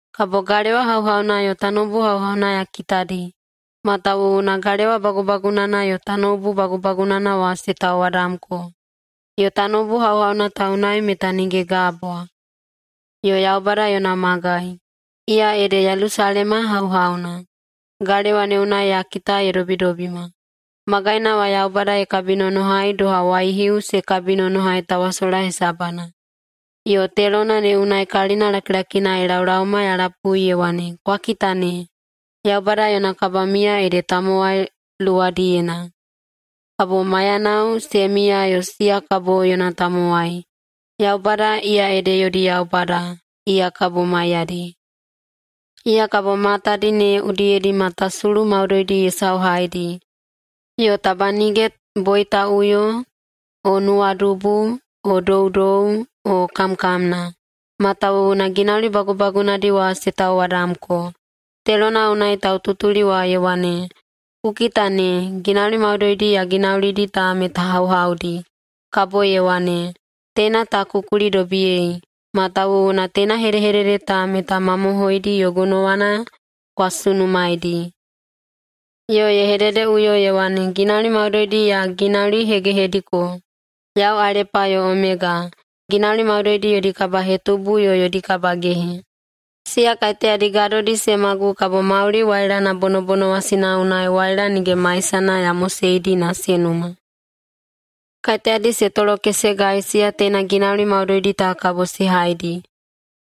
Kabo galewa hauhauna yo tanoubu hauhauna ya kitadi, matawuwuna galewa bagubagunana yo tanoubu bagubagunana wa se tauwadamko. Yo tanoubu hauhauna ta unai meta nige gabwa. Yo Yaubada yona magai, iya ede Yelusalema hauhauna, galewa ne unai ya kita ye dobidobima. Magaina wa Yaubada ye kabinonohai doha waihiu se kabinonohai tawasola hesabana. Yo telona ne unai kalina lakilakina ye laolaoma ya lapui ye wane, “Kwa kita ne! Yaubada yona kabamiya ede tamowai luwadiyena. Kabo maiyanao se miya yo siya kabo yona tamowai. Yaubada, iya ede yodi Yaubada, iya kabo maiyadi. Iya kabo matadi ne udiyedi matasulu maudoidi ye sauhaidi, yo taba nige boitaꞌuyo o nuwadubu o doudou o kamkamna. Matawuwuna ginauli bagubagunadi wa se tauwadamko.” Telona unai taututuli wa ye wane, “Ku kita ne, ginauli maudoidi ya ginaulidi ta meta hauhaudi!” Kabo ye wane, “Teina ta ku kulidobiyei, matawuwuna teina hedehedede ta meta mamohoidi yo gonowana kwa sunumaeidi!” Yo ye hededeꞌuyo ye wane, “Ginauli maudoidi ya ginaulihegehediko! Yau Alepa yo Omega, ginauli maudoidi yodi kabahetubu yo yodi kabagehe. Siya kaiteyadi gadodi se magu kabo mauli wailana bonobonowasina unai waila nige maisana ya moseidi se numa. Kaiteyadi se tolokesegai, siya teina ginauli maudoidi ta kabo se haidi,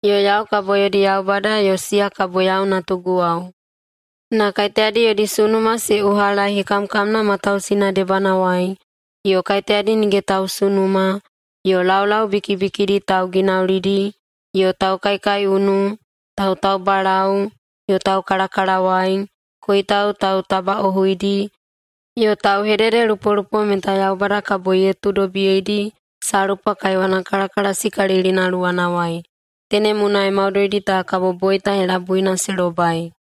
yo yau kabo yodi Yaubada yo siya kabo yau natuguwao. Na kaiteyadi yodi sunuma se uhalai hekamkamna matausina debanawai, yo kaiteyadi nige tausunuma, yo laulau bikibikidi tauginaulidi, yo taukaikaiunu, tautaubalau yo taukalakalawai, koitau tautabaꞌohuidi, yo tauhededelupolupo meta Yaubada kabo ye tuudobiyeidi salpa kaiwana kalakalasikalilina luwanawai. Tenem unai maudoidi ta kabo boita helabuina se lobai.”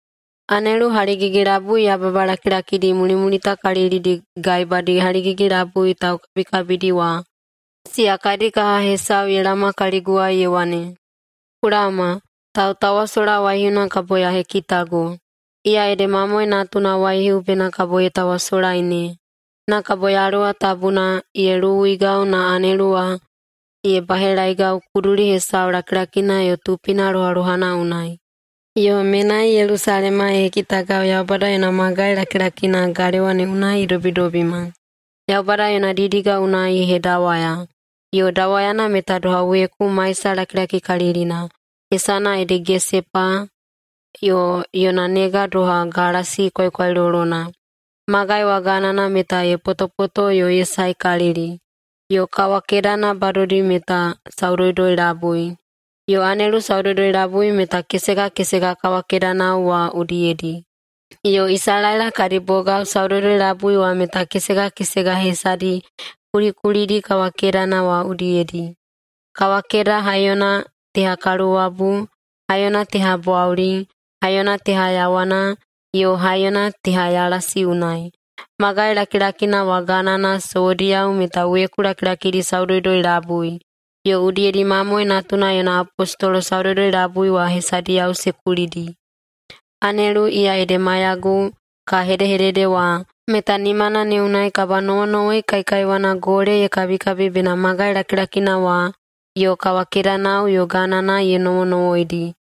Anelu haligigi-labui yababa lakilakidi mulimulitakalilidi gaebadi haligigi-labui taukabikabidi wa, siya kadi kaha hesau ye laoma kaliguwai ye wane, “Ku laoma, tautawasola waihiuna kabo ya hekitago. Iya ede Mamoe Natuna waihiu bena kabo ye tawasolai ne!” Na kabo Yaluwa Tabuna ye luwuigau na anelu wa ye bahelaeigau kuduli hesau lakilakina yo tupina lohalohana unai. Yo menai Yelusalema ye hekitagau, Yaubada yona magai lakilakina, galewa ne unai ye dobidobima. Yaubada yona didiga unai ye hedawaya, yo dawayana meta doha weku maisalakilakikalilina, hesana ede gesepa, yo yona nega doha galasi kwaikwailolona. Magai wa ganana meta ye potopoto yo ye saekalili, yo kawakedana badodi meta saudoudoi-labui. Yo anelu saudoudoi-labui meta kesega kesega kawakedanao wa udiyedi. Yo Isalaela kadi bogao saudoudoi-labui wa meta kesega kesega hesadi kulikulidi kawakedana wa udiyedi. Kawakeda haiyona teha kaluwabu, haiyona teha bwauli, haiyona teha yawana, yo haiyona teha yalasi unai. Magai lakilakina wa ganana sowodiyao meta weku lakilakidi saudoudoi-labui, yo udiyedi Mamoe Natuna yona apostolo saudoudoi-labui wa hesadiyao se kulidi. Anelu, iya ede maiyagu ka hedehedede wa, meta nimana ne unai kabanowonowoi kaikaiwana gole ye kabikabi bena magai lakilakina wa yo kawakedanao yo ganana ye nowonowoidi.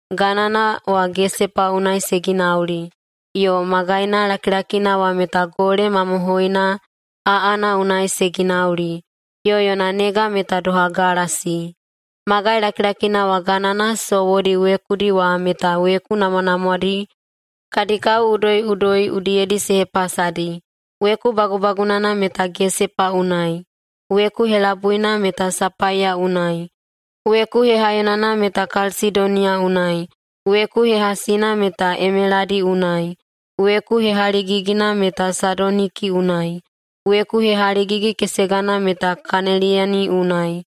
Ganana wa gesepa unai se ginauli, yo magaina lakilakina wa meta gole mamohoina aꞌana unai se ginauli, yo yona nega meta doha galasi. Magai lakilakina wa ganana sowodi wekudi wa meta weku namwanamwadi kadi kao udoiꞌudoi udiyedi se hepasadi. Weku bagubagunana meta gesepa unai, weku helabuina meta sapaiya unai, weku hehaiyonana meta kalsidoniya unai, weku hehasina meta emeladi unai, weku hehaligigina meta sadoniki unai, weku hehaligigi-kesegana meta kaneliyeni unai,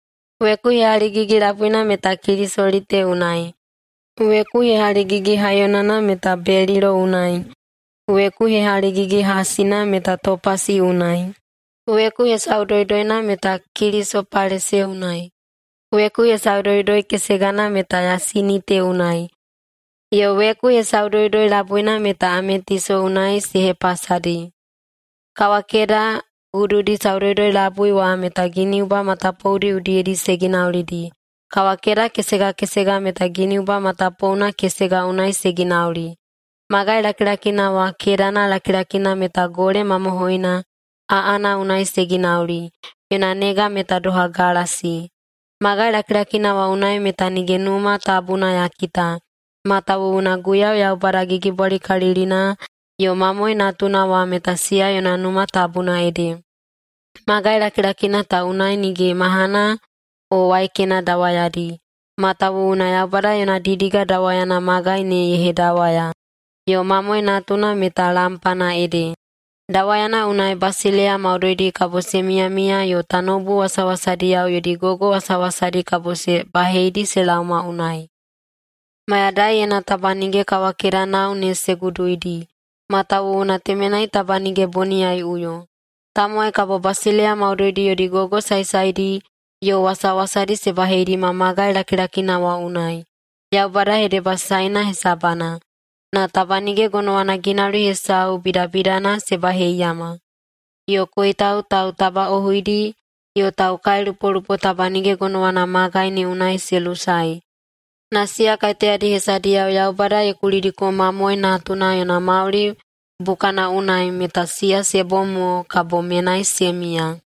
weku hehaligigi-labuina meta kilisolite unai, weku hehaligigi-haiyonana meta belilo unai, weku hehaligigi-hasina meta topasi unai, weku hesaudoudoina meta kilisopalase unai, weku hesaudoudoi-kesegana meta yasinite unai, yo weku hesaudoudoi-labuina meta ametiso unai se hepasadi. Kawakeda gududi saudoudoi-labui wa meta giniuba matapoudi udiyedi se ginaulidi, kawakeda kesega kesega meta giniuba matapouna kesega unai se ginauli. Magai lakilakina wa kedana lakilakina meta gole mamohoina aꞌana unai se ginauli, yona nega meta doha galasi. Magai lakilakina wa unai meta nige Numa Tabuna ya kita, matawuwuna Guiyau Yaubada Gigibwalikalilina yo Mamoe Natuna wa meta siya yona Numa Tabuna ede. Magai lakilakina ta unai nige mahana o waikena dawayadi, matawuwuna Yaubada yona didiga dawayana magai ne ye hedawaya, yo Mamoe Natuna meta lampana ede. Dawayana unai basileiya maudoidi kabo se miyamiya yo tanoubu wasawasadiyao yodi gogo wasawasadi kabo se baheidi se laoma unai. Mayadaiyena taba nige kawakedanao ne se guduidi, matawuwuna temenai taba nige boniyaiꞌuyo. Tamowai kabo basileiya maudoidi yodi gogo saesaedi yo wasawasadi se baheidima magai lakilakina wa unai, Yaubada hedebasaena hesabana. Na taba nige gonowana ginauli hesau bidabidana se baheiyama, yo koitau tautabaꞌohuidi yo taukailupolupo taba nige gonowana magai ne unai se lusae, na siya kaiteyadi hesadiyao Yaubada ye kulidiko Mamoe Natuna yona mauli bukana unai meta siya se bom mo kabo menai se miya.